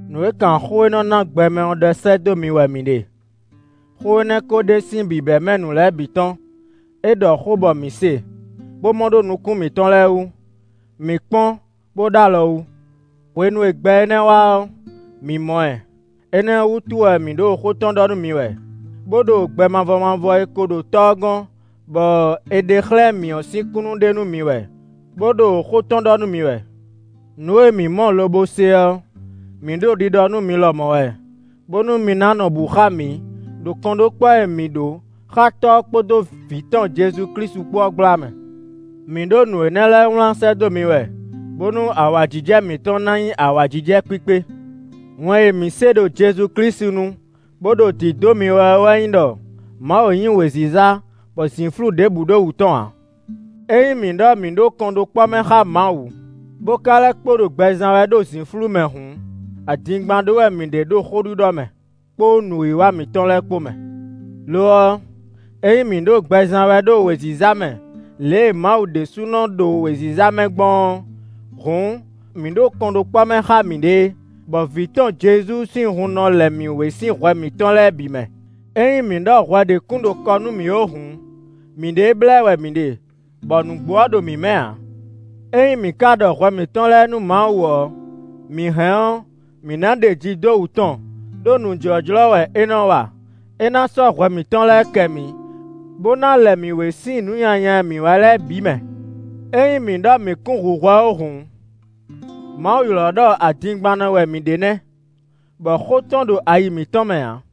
Nǔ e kan xó e nɔ na gbɛ mɛ ɔ́ ɖɔ sɛ́ dó mi wɛ mǐ ɖe. Xó énɛ́ ko ɖe sín bǐbɛ́mɛ nǔ lɛ́ɛ bǐ tɔn; é ɖɔ xó bɔ mǐ se, bó mɔ ɖó nukún mǐtɔn lɛ́ɛ wú; mǐ kpɔ́n bó ɖ'alɔ wú. Hwenu e gbɛ énɛ́ wá ɔ́, mǐ mɔ ɛ. Énɛ́ ɔ́ wútu wɛ mǐ ɖo xó tɔn ɖɔ nú mi wɛ, bó ɖo gbɛ mavɔ mavɔ e ko ɖo Tɔ́ ɔ́ gɔ́n, bɔ è ɖe xlɛ́ mǐ ɔ́ sín kúnnu ɖe nú mi wɛ, bó ɖo xó tɔn ɖɔ nú mi wɛ. Nǔ e mǐ mɔ lobo se ɔ́, mǐ ɖo ɖiɖɔ nú mi lɔmɔ̌ wɛ, bónú mi ná nɔ bǔ xá mǐ ɖo kɔnɖókpɔ́ e mǐ ɖó xá Tɔ́ ɔ́ kpódó Vǐ tɔn Jezu Klísu ɔ́ kpó ɔ́ gbla mɛ. Mǐ ɖo nǔ énɛ́ lɛ́ɛ wlán sɛ́ dó mi wɛ, bónú awǎjijɛ mǐtɔn ná nyí awǎjijɛ kpíkpé. Wɛn e mǐ se ɖo Jezu Klísu nu, bó ɖo dǐdó mi wɛ ɔ́ wɛ nyí ɖɔ Mawu nyí wěziza, bɔ zǐnflú ɖěbǔ ɖo wǔ tɔn ǎ. Ényí mǐ ɖɔ mǐ ɖo kɔnɖókpɔ́ mɛ xá Mawu, bó ka lɛ́ kpo ɖo gbɛ zán wɛ ɖo zǐnflú mɛ hǔn, adingban ɖó wɛ mǐ ɖe ɖo xó ɖiɖɔ mɛ, kpó nǔwiwa mǐtɔn lɛ́ɛ kpó mɛ. Lo ɔ́, ényí mǐ ɖo gbɛ zán wɛ ɖo wěziza mɛ lě e Mawu ɖésúnɔ ɖo wěziza mɛ gbɔn ɔ́, hǔn mǐ ɖo kɔnɖókpɔ́ mɛ xá mǐɖée, bɔ vǐ tɔn Jezu sín hun nɔ lɛ mǐ wé sín hwɛ mǐtɔn lɛ́ɛ bǐ mɛ. Ényí mǐ ɖɔ hwɛ ɖě kún ɖo kɔ nú mǐ ó hǔn, mǐɖée blɛ́ wɛ mǐ ɖe, bɔ nǔgbó ɔ́ ɖo mǐ mɛ ǎ. Ényí mǐ ka ɖɔ hwɛ mǐtɔn lɛ́ɛ nú Mawu ɔ́, mǐ hɛn ɔ́, mǐ ná ɖeji dó wǔ tɔn, ɖó nǔ jlɔ́jlɔ́ wɛ é nɔ wa; é ná sɔ́ hwɛ mǐtɔn lɛ́ɛ kɛ mǐ, bó ná lɛ mǐ wé sín nǔ nyanya e mǐ wa lɛ́ɛ bǐ mɛ. Ényí mǐ ɖɔ mǐ kún hu hwɛ ó hǔn, Mawu ylɔ́ ɖɔ adingbannɔ wɛ mǐ ɖe nɛ́, bɔ xó tɔn ɖo ayi mǐtɔn mɛ ǎ.